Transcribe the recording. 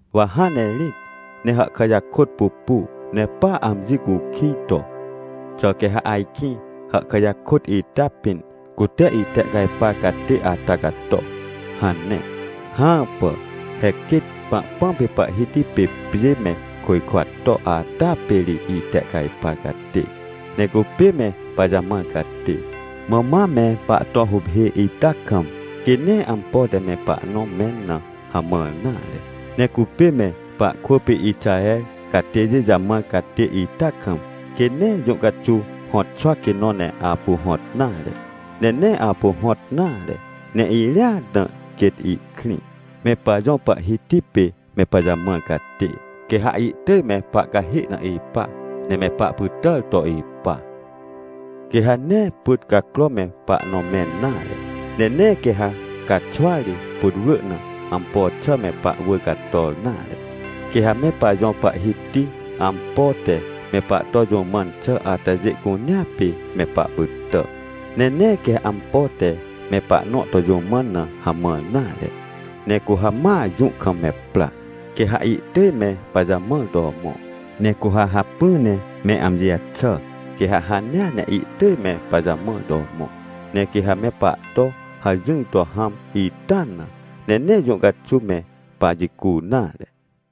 Wa hãn ne rĩt ne hàhkà jakôt pupu ne pa amji cukij to: “Xà quê ha ajkĩ hàhkà jakôt ita pĩn, cute itehcajpar catê ata cato?” hane. Hãpà! He quêt Pahpãm pê Pahhiti pê pjê me côjkwa to ata pê ri itehcajpar catê! Ne cupê me pajamãr catê, mã ma me pahto huphê ita kam, quê nee ampo te me pahnõ mẽn na hamãr nare. Ne cupê me pahkwỳ pê Ixaher catêjê jamãr catê ita kam, quê nee jũ caxuw hõtxwa quê nõ ne apu hõt nare. Ne nee apu hõt nare, ne irĩat na quêt ihkrĩ. Me pajõ Pahhiti pê me pajamãr catê, quê ha ihtỳj me pahcahê na ipa ne me pahpytàr to ipa. Quê ha nee pyt cacro me pahnõ mẽn nare, ne nee quê ha caxwa ri, putwrỳ na, ampo xà me pahwỳr cator nare. Quê ha me pajõ Pahhiti ampo te me pahto jũ mãn xà atajê cunea pê me pahpytà, ne nee quê ampo te me pahnõ to jũ mãn na hamãr nare. Ne cu ha ma jũ kam me pra, quê ha ihtỳj me pajamãr to mõ, ne cu ha hacpỹ ne me amji jaxà, quê ha hanea ne ihtỳj me pajamãr to mõ. Ne quê ha me pahto hajỹr to hãm ita na, ne nee jũ caxuw me pajicu nare.